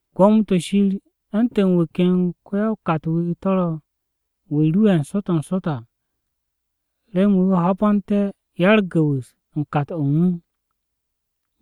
“Gwo̱mo-to̱ Shir u̱ntu̱n wu̱ ken ko-ya-o-kat-wu̱ to̱ ro̱ wu̱ ru'e̱ n-sot n-sot à, remen wu̱ ho̱bo̱nté̱ ya-u̱r-gu̱wu̱s u̱n kat-o̱ u̱n wu̱.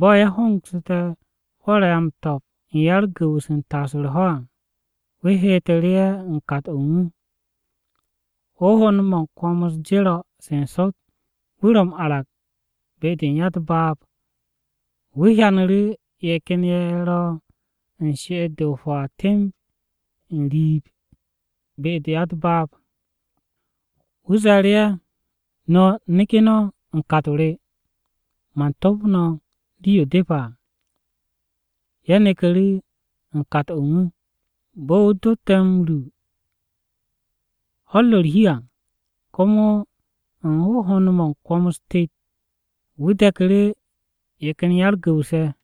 Bo̱ ye̱ hongsu̱te̱ hwo̱r-ye̱ a m-to̱p u̱n ya-u̱r-gu̱wu̱s u̱n taas u̱r-ho̱ à, wu̱ heetu̱ru̱ ye̱ u̱n kat-o̱ u̱n wu̱. “Hohond-mo̱ u̱n kwo̱m-u̱s jero̱ se n-sot, wu̱ ro̱ m-arag be-de u̱n ya-u̱t-baab, wu̱ hyanu̱ru̱ ye̱ ken ye̱ ro̱ u̱n she'et-de o-hwaa temb n-riib be-de u̱t-baab. Wu̱ ze̱e̱ru̱ ye̱, ‘No̱, neke̱ no̱ u̱n kat-o re, man top no̱ rii-yo depe̱ à.’ Ye̱ neku̱ru̱ u̱n kat-o̱ u̱n wu̱. Bo̱ wu̱ dotte̱ m-ru ho̱-u̱r ro̱ u̱r-hi à, komo u̱n hohond-mo̱ u̱n kwo̱m-u̱s tet, wu̱ de̱ku̱ru̱ ye̱ ken ya-u̱r-gu̱wu̱s ye̱.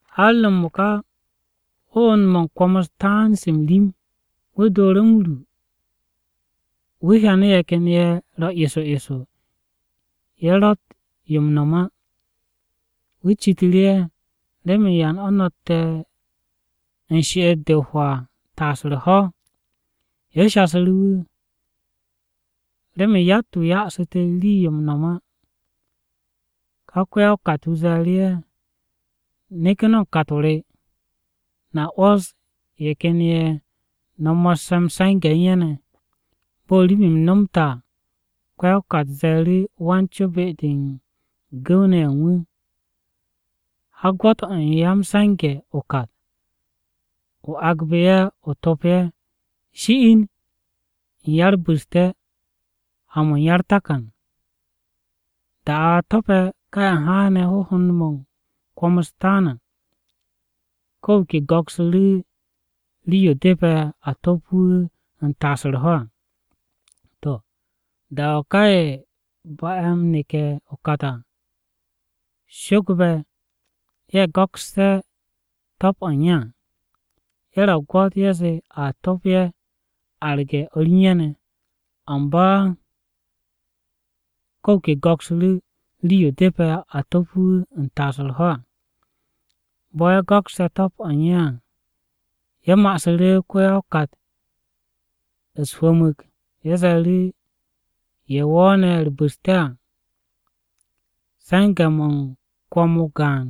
“Har m-mo̱ka hohond-mo̱ u̱n kwo̱m-u̱s taan se m-rim, wu̱ dooru̱ m-ru wu̱ hyanu̱ ye̱ ken ye̱ ro̱ eso eso ye̱ ro̱tt yo m-no̱m á. Wu̱ citu̱ru̱ ye̱, ‘¿Remen yan o̱ no̱tte̱ u̱n she'et-de o-hwaa taas u̱r-ho̱?’ “Ye̱ shasu̱ru̱ wu̱, ‘Remen yatt-wu̱ ya'asu̱ te̱ rii-yo m-no̱m á.’ “Ká ko-ya-o-kat-wu̱ ze̱e̱ru̱ ye̱, ‘Neke̱ no̱ u̱n kat-o re, no̱a 'wo̱s ye̱ ken ye̱ no̱ mo̱sse̱ m-se̱nge̱ u̱n ye̱ ne̱.’ “Bo̱ rim-m nomte̱ à, ko-ya-o-kat ze̱e̱ru̱ wan-co be-de u̱n gu̱w-ne̱ ye̱ u̱n wu̱, ‘Ha o gwo̱to̱n ya-m-se̱nge̱ o-kat. Agbe̱ ye̱ o to̱p ye̱, shi'in u̱n ya-u̱r-bu̱ste̱ ha-mo̱ u̱n ya-u̱r-takan.’ “Da-o̱ a to̱pe̱ ka ye̱ haane̱ hohond-mo̱ u̱n kwo̱m-u̱s taan à, ko̱ wu̱ ke go̱ksu̱ru̱ rii-yo depe̱ a top wu̱ u̱n taas u̱r-ho̱ à. To̱, da-o̱ ka ye̱ ba'e̱ m-neke̱ o-kat à, sho̱gbe̱ ye̱ go̱kste̱ top-o̱ u̱n ye̱ à, ye̱ ro̱ o-gwo̱t ye̱ zee a top ye̱ arge̱ o̱r u̱n ye̱ ne̱. Amba ko̱ wu̱ ke go̱ksu̱ru̱ rii-yo depe̱ a to̱p wu̱ u̱n taas u̱r-ho̱ à. Bo̱ ye̱ go̱kste̱ top-o̱ u̱n ye̱ à, ye̱ ma'asu̱ru̱ ko-ya-o-kat u̱s-hwu̱hwu̱mu̱g. Ye̱ ze̱e̱ru̱, ‘Ye̱ wo̱o̱ne̱ u̱r-bu̱ste̱ à se̱nge̱-mo̱ u̱n kwo̱m-o gaan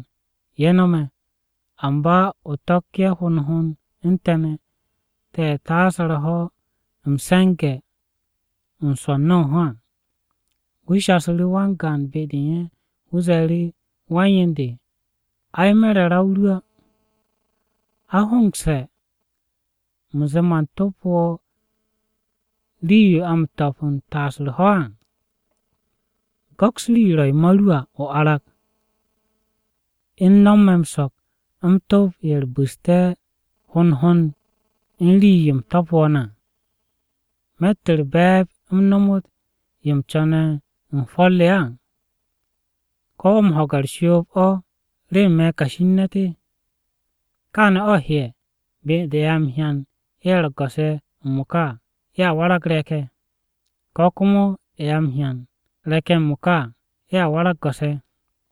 ye̱ no̱me̱, amba o to̱k ye̱ hond hond u̱n te̱ ne̱, te̱ ye̱ taase̱ u̱r-ho̱ m-se̱nge̱ m-swo̱ n-no̱o̱nho̱ à.’ “Wu̱ shasu̱ru̱ wan-gaan be-de u̱n ye̱, wu̱ ze̱e̱ru̱, ‘Wan-yen de, ai, me̱ re̱ ra-o ru á. ¿A hongse̱, u̱m zee man top wo̱ rii-yo a m-to̱p u̱n taas u̱r-ho̱ á? Go̱ks rii-yo ro̱ yo ma ru à o arag. U̱n no̱m me̱ m-so̱k u̱m to̱p ye̱ bu̱ste̱ m-wo̱o̱n à hond hond u̱n rii-yo u̱m to̱pu̱ wo̱ ne̱ à. ¿Me̱tt o̱ u̱r-be̱e̱b u̱m nomot yo u̱m co̱ne̱ u̱n hwo̱r re á? ¿Ko̱ wo̱ m-ho̱ge̱ u̱r-shoob o̱ remen me̱ kashi u̱n ne̱t-wu̱?’ “Káane̱ o̱ heye̱ be-de u̱n ye̱ a m-hyan ye̱ ro̱ go̱s-ye̱ m-mo̱ka à, ye̱a warag re̱k-ye̱. Kane̱ komo ye̱ a m-hyan re̱k-ye̱ m-mo̱ka à, ye̱a warag go̱s-ye̱.”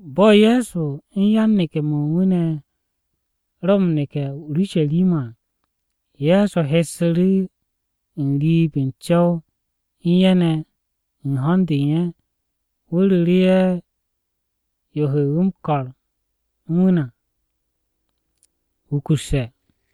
Bo̱ Ye̱so u̱n yan-neke̱-mo̱ u̱n wu̱ ne̱ ro m-neke̱ o-Urusharima à, Ye̱so hessu̱ru̱ n-riib n-co̱w u̱n ye̱ ne̱ u̱n ho̱n-de u̱n ye̱, wu̱ ru̱ru̱ ye̱ yo he m-ko̱r u̱n wu̱ ne̱ à wukusse̱.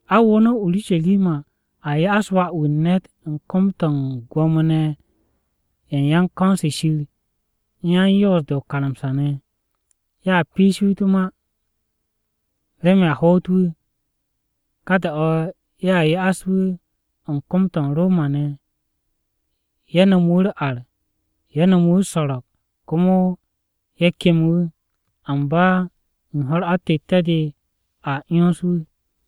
“A wo no̱ o-Urusharima. A ya'as Wà-wu̱ u̱n ne̱t u̱n kom-to̱ u̱n Gwo̱mo-ne̱ ye̱ u̱n ko̱n-se Shir u̱n yan-Yoos-de o-karamsa ne̱. Ye̱a piish wu̱ u̱t-ma, remen a hoot wu̱. Ka da-o̱ ye̱a ya'as wu̱ u̱n kom-to̱ u̱n Roma-ne̱. Ye̱ nomo wu̱ u̱r-ar, ye̱ nomo wu̱ u̱s-so̱ro̱g, komo ye̱ kem wu̱. Amba u̱n ho̱-u̱r atette̱-de a 'yons wu̱.”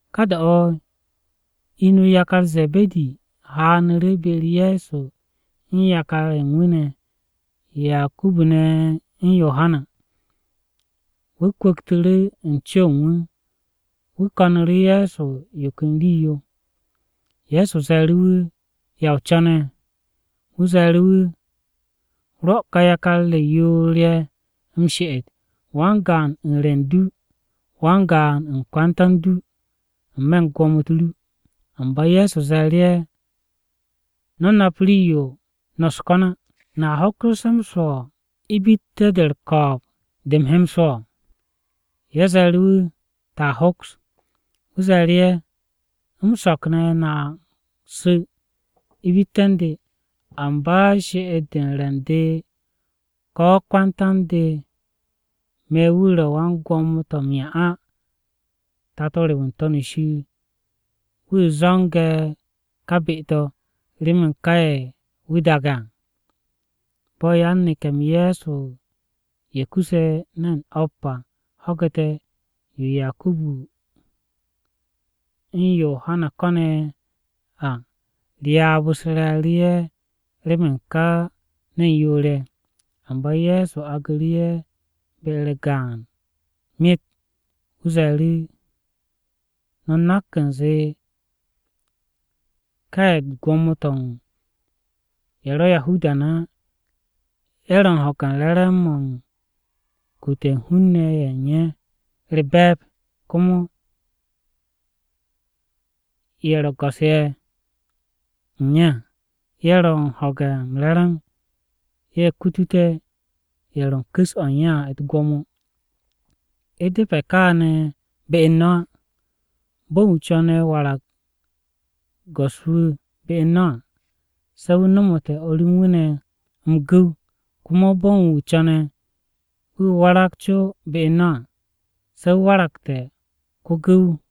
Ka da-o̱, inu yakar Ze̱be̱di haanu̱ru̱ be-u̱r Ye̱so u̱n yakar-ye̱ u̱n wu̱ ne̱, Yakubu u̱n Yohana ne̱. Wu̱ kwu̱ktu̱ru̱ u̱n co-o̱ u̱n wu̱, wu̱ ko̱nu̱ru̱ Ye̱so yo ken rii-yo. Ye̱so ze̱e̱ru̱ wu̱, “¿Ya o co̱ne̱?” Wu̱ ze̱e̱ru̱ wu̱, “Rwo̱ kà yakar re yoor-ye̱ m-she'et, wan-gaan u̱n re̱ u̱n du, wan-gaan u̱n kwanta u̱n du, n-me̱ u̱n gwo̱mo-u̱t ru.” Amba Ye̱so ze̱e̱ru̱ ye̱, “No̱ nap rii-yo no̱ u̱s-ko̱n á! ¿No̱a hoksu̱sse̱ m-swo̱ ibitte̱-de u̱r-ko̱o̱b de u̱m he m-swo̱?” Ye̱ ze̱e̱ru̱ wu̱, “Te̱a hoks.” Wu̱ ze̱e̱ru̱ ye̱, “M-so̱k ne̱, no̱a su̱ ibitte̱ u̱n de. Amba she'et-de u̱n re̱ u̱n de ko̱ kwanta u̱n de me̱ wu̱ ro̱ wan-gwo̱mo-to̱ m-'ya á. Tato re wu̱ n-To̱n shir, wu̱ zo̱ngse̱ ka be-to̱, remen ká ye̱ wu̱ daage̱ à.” Bo̱ yan-neke̱-m Ye̱so ye̱ kuse̱ ne̱n o̱p à ho̱gu̱te̱ yo Yakubu u̱n Yohana ko̱n ne̱ à, ryaab-u̱s re̱e̱ru̱ ye̱ remen ká ne̱n yoor-ye̱. Amba Ye̱so agnu̱ru̱ ye̱ be-u̱r gaan myet. Wu̱ ze̱e̱ru̱, “No̱ nak u̱nze ka ye̱ u̱t-gwo̱mo to̱ u̱n ye̱ ro Yahuda ne̱ á, ye̱ ro̱ u̱n ho̱ge̱ m-re̱re̱m mo̱ u̱n kute̱ u̱n hun-ne̱ ye̱ u̱n ye̱ u̱r-be̱e̱b. Komo ye̱ ro̱ go̱s-ye̱ go̱s-ye̱ u̱n ye̱ à, ye̱ ro̱ u̱n ho̱ge̱ m-re̱re̱m ye̱ kutute̱ ye̱ ro̱ u̱n ku̱s-o̱ u̱n ye̱ à u̱t-gwo̱mo. U̱ depe̱ kaane̱ be u̱n no̱ á. Bo̱n wu̱ co̱ne̱ wu̱ warag go̱s-wu̱ be u̱n no̱ à se̱ wu̱ nomote̱ o̱r u̱n wu̱ ne̱ m-gu̱w. Komo bo̱ u̱n wu̱ co̱ne̱ wu̱ warag co be u̱n no̱ à, se̱ wu̱ waragte̱ ko-gu̱w no̱.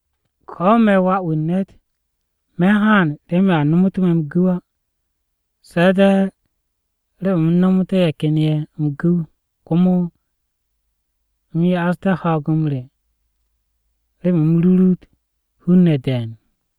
Ko̱ me̱ ma, Wà-wu̱ u̱n ne̱t me̱ haan remen a nomotú̱ me̱ m-gu̱w á, se̱ de̱ remen u̱m nomoté̱ ye̱ ken ye̱ m-gu̱w. Komo u̱m ya'asté̱ ho̱o̱g-m re remen u̱m rurut hun-ne̱ de̱e̱n.”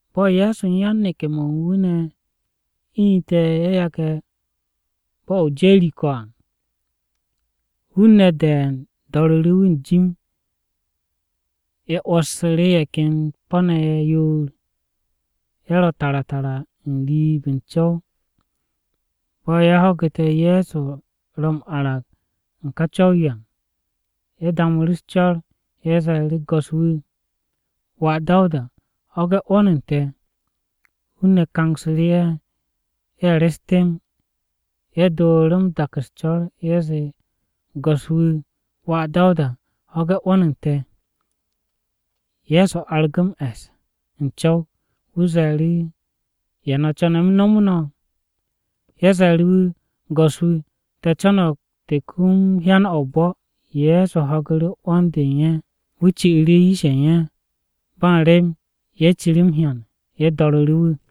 Bo̱ Ye̱so u̱n yan-neke̱-mo̱ u̱n wu̱ ne̱ inu̱te̱ ye̱ yage̱ bo̱-o̱ o-Jeriko à, hun-ne̱ de̱e̱n do̱ru̱ru̱ wu̱ n-jim. Ye̱ 'wo̱ssu̱ru̱ ye̱ ken po̱-ne̱ ye̱ yoor, ye̱ ro tara tara n-riib n-co̱w. Bo̱ ye̱ ho̱gu̱te̱ Ye̱so ro m-arag u̱n ká co̱w-yo à, ye̱ damu̱ u̱s-co̱r. Ye̱ ze̱e̱ru̱, “Go̱s-wu̱, Wà Dawuda! Ho̱ge̱ 'wo̱n u̱n te̱!” Hun-ne̱ kangsu̱ru̱ ye̱, ye̱ re̱s temb. Ye̱ dooru̱ m-dak u̱s-co̱r. Ye̱ zee, “Go̱s-wu̱, Wà Dawuda! Ho̱ge̱ 'wo̱n u̱n te̱!” Ye̱so argu̱ m-e̱s u̱n co̱w, wu̱ ze̱e̱ru̱, “¿Ya no̱ co̱ne̱ u̱m nomo no̱?” Ye̱ ze̱e̱ru̱ wu̱, “Go̱s-wu̱, te̱ co̱no̱g te̱ kum hyan-o̱ o-bo̱.” Ye̱so ho̱gu̱ru̱ 'wo̱n-de u̱n ye̱. Wu̱ ci'u̱ru̱ yish-ye̱ u̱n ye̱. Ba u̱n rem, ye̱ ciru̱ m-hyan! Ye̱ do̱ru̱ru̱ wu̱.